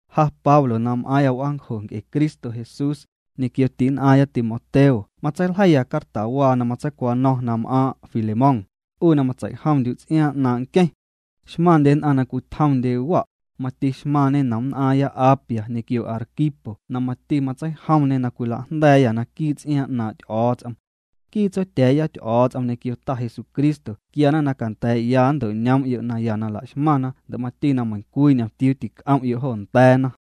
Ja Pablo na m'aaⁿya w'aancjo nc'e Cristo Jesús, ñequio ti'nn'aⁿya Timoteo matseiljeiya cartawaa na matseicwano̱ⁿ na m'aaⁿ' Filemón, 'u na matsei'jomndyu' ts'iaaⁿ 'naaⁿ' nqueⁿ. Xmaⁿndye nn'aⁿ na cwitjomndye wa', mati xmaⁿñe nomnn'aaⁿya Apia ñequio Arquipo na mati matseijomñê na cwilajnda̱a̱yâ naquii' ts'iaaⁿ 'naaⁿ' Ty'o̱o̱ts'om. Nquii Tsotya̱a̱ya Ty'o̱o̱ts'om ñequio Ta Jesucristo quiana na canda̱a̱'ya nnto'ñoom'yo' naya na la'xmaⁿna ndo' mati na meiⁿ cwii ñomtiuu tic'om'yo' jo nda̱a̱na.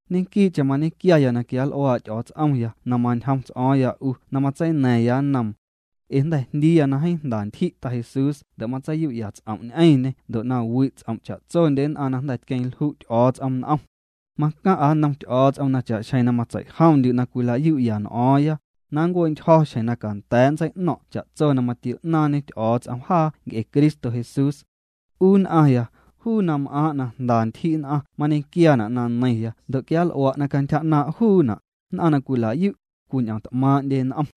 Ñequii'cheⁿ mañequiaya na quial'uaa' Ty'o̱o̱ts'omya na mañjom ts'o̱o̱ⁿya 'u na matseina̱ⁿya nnoom. Ee jnda̱ jndiiya na jeeⁿ jnda ntyji' Ta Jesús ndo' matseiyu'ya ts'om' ñ'eⁿñê ndo' na wi' ts'om' cha'tsondye nn'aⁿ na jnda̱ tqueⁿlju' Ty'o̱o̱ts'om n'om. Macaⁿ'a nnom Ty'o̱o̱ts'om na cha'xjeⁿ matseijomndyu' na cwila'yu'ya cwii n'o̱o̱ⁿya, na nncue'ntyjo̱ xjeⁿ na canda̱a̱' nntseino̱ⁿ' cha'tso na matio'naaⁿñe Ty'o̱o̱ts'om jaa nc'e Cristo Jesús. 'U nn'aⁿya, juu na m'aaⁿ' na jnda ntyji' nn'aⁿ mañequiaana' na neiⁿya ndo' quianl'ua' na cantyja 'naaⁿ' juuna', nn'aⁿ na cwilayu', cwiñ'omt'maaⁿ'ndye n'om.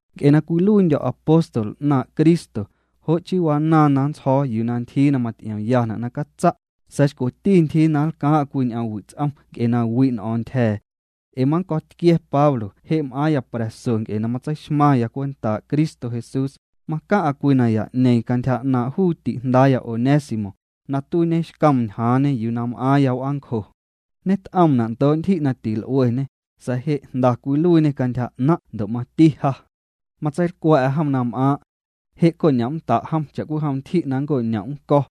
Nc'e na cwiluiindyo̱ apóstol 'naaⁿ' Cristo ja, jo' chii wanaaⁿ na nntsjo̱o̱ yuu na ntyjii na maty'iomyana' na catsa', sa̱a̱ xcweti ntyjii na nlcaaⁿ'a cwii ñ'omwi' ts'om nc'e na wi' n'o̱o̱ⁿ ntyja̱a̱. Ee mannco̱tquia̱ Pablo je' m'aaⁿya pra̱so nc'e na tseixmaⁿya cwentaa' Cristo Jesús, macaⁿ'a cwii naya'ñeeⁿ cantyja 'naaⁿ' juu ti'jndaaya Onésimo, na tuiiñexcoom ñjaaⁿñe yuu na m'aaⁿya w'aancjo. Ñet'oomna' ndoo' ntyji' na til'ueñê, sa̱a̱ je' jnda cwiluiiñê cantyja 'naⁿ' ndo' mati ja. Matseilcwa̱'a jom na m'aaⁿ'. Je' coñom'nnda' jom cha'cwijom ntyji' na nnco'ñom' nnco̱.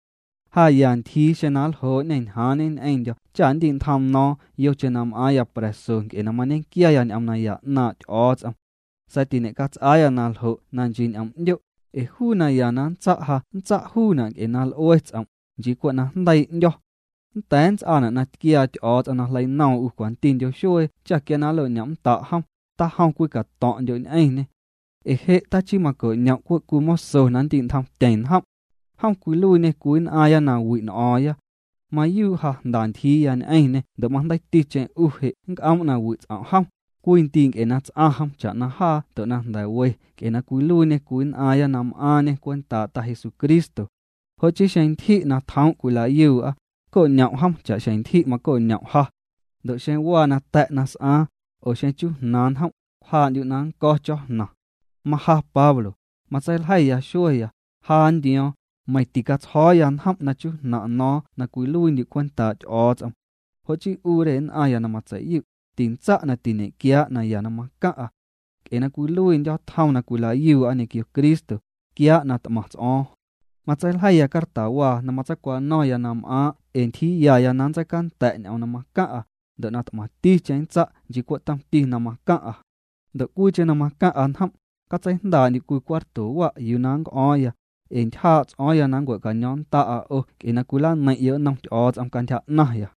Ja ya ntyjii xeⁿ na ljoo'ñê ñjaaⁿñe ñ'eⁿndyo̱ cha nndi'ntjoom no̱o̱ⁿ yocheⁿ na m'aaⁿya pra̱so nc'e na mañequiaya ñ'oom naya 'naaⁿ' Ty'o̱o̱ts'om. Sa̱a̱ tiñe'cats'aa na ljo' na nchii ñ'om'ndyo', ee juu naya na nntsa' ja nntsa' juuna' nc'e na l'ue ts'om', nchii cwe' na jndeii' 'ndyo̱. Nnda̱a̱ nnts'aana' na tquiaa Ty'o̱o̱ts'om na jleinoom 'u cwantindyo xuee cha quia na nlo'ñom'nnda' jom, tajom cwii cato̱ⁿ'ndyo' ñ'eⁿñê. Ee je' tachii maco'ñom' cwe' cwii moso na ndi'ntjomtyeⁿ njom'. Jom cwiluiiñê cwii nn'aaⁿya na wi' n'o̱o̱ⁿya. Mayuu' ja jnda ntyjiiya ñ'eⁿñê ndo' majndeiiticheⁿ 'u je' nnc'oom' na wi' ts'om' jom, cwii ndii' nc'e na ts'aⁿ jom cha'na jaa ndo' jnda̱ we nc'e na cwiluiiñê cwii nn'aaⁿya na m'aaⁿñê cwentaa' Ta Jesucristo. Jo' chii xeⁿ ntyji' na tjoom' cwilayuu'a, co'ñom' jom cha'xjeⁿ ntyji' maco'ñom' ja. Ndo' xeⁿ waa cwii nata̱' na s'aaⁿ, oo xeⁿ chujnaaⁿ njom', cwjaa'ndyu' na nnco̱ cho̱jnaⁿ. Maja Pablo, matseiljeiya xueeya, ja nndio̱o̱ⁿ, meiⁿ na ticatsjo̱o̱ya njom' na chujnaⁿ' no̱o̱ⁿ na cwiluiindyu' cwentaa' Ty'o̱o̱ts'om. Jo' chii 'u re nn'aⁿya na matseiyu', tintsa' na tiñe'quiaa' naya na macaⁿ'a. Nc'e na cwiluiindyo̱ tjom na cwilayu'a ñequio Cristo, quiaa' na t'maⁿ ts'o̱o̱ⁿ. Matseiljeiya cartawaa na matseicwano̱ⁿya na m'aaⁿ' ee ntyjiiyaya na nntseicanda̱' ñ'oom na macaⁿ'a, ndo' na t'maⁿticheⁿ nntsa' nchii cwe' tomti na macaⁿ'a. Ndo' cwiicheⁿ na macaⁿ'a njom', catseijndaa'ndyu' cwii cuarto wa' yuu na nnc'o̱o̱ⁿya, ee ntyjaa' ts'o̱o̱ⁿya na nncua̱caño̱o̱ⁿnnda'a 'o nc'e na cwilaneiⁿ'yo' nnom Ty'o̱o̱ts'om cantyja 'naⁿya.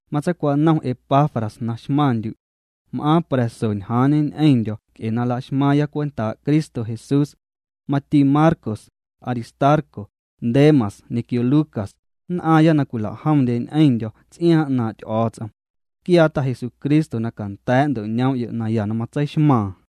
Matseicwanom Epafras na xmaⁿndyu'. M'aaⁿ pra̱so ñjaaⁿñe ñ'eⁿndyo̱ nc'e na laxmaaⁿya cwentaa' Cristo Jesús. Mati Marcos, Aristarco, Demas ñequio Lucas, nn'aaⁿya na cwila'jomndye ñ'eⁿndyo̱ ts'iaaⁿ 'naaⁿ' Ty'o̱o̱ts'om. Quiaa Ta Jesucristo na canda̱a̱' nnto'ñoom'yo' naya na matseixmaaⁿ.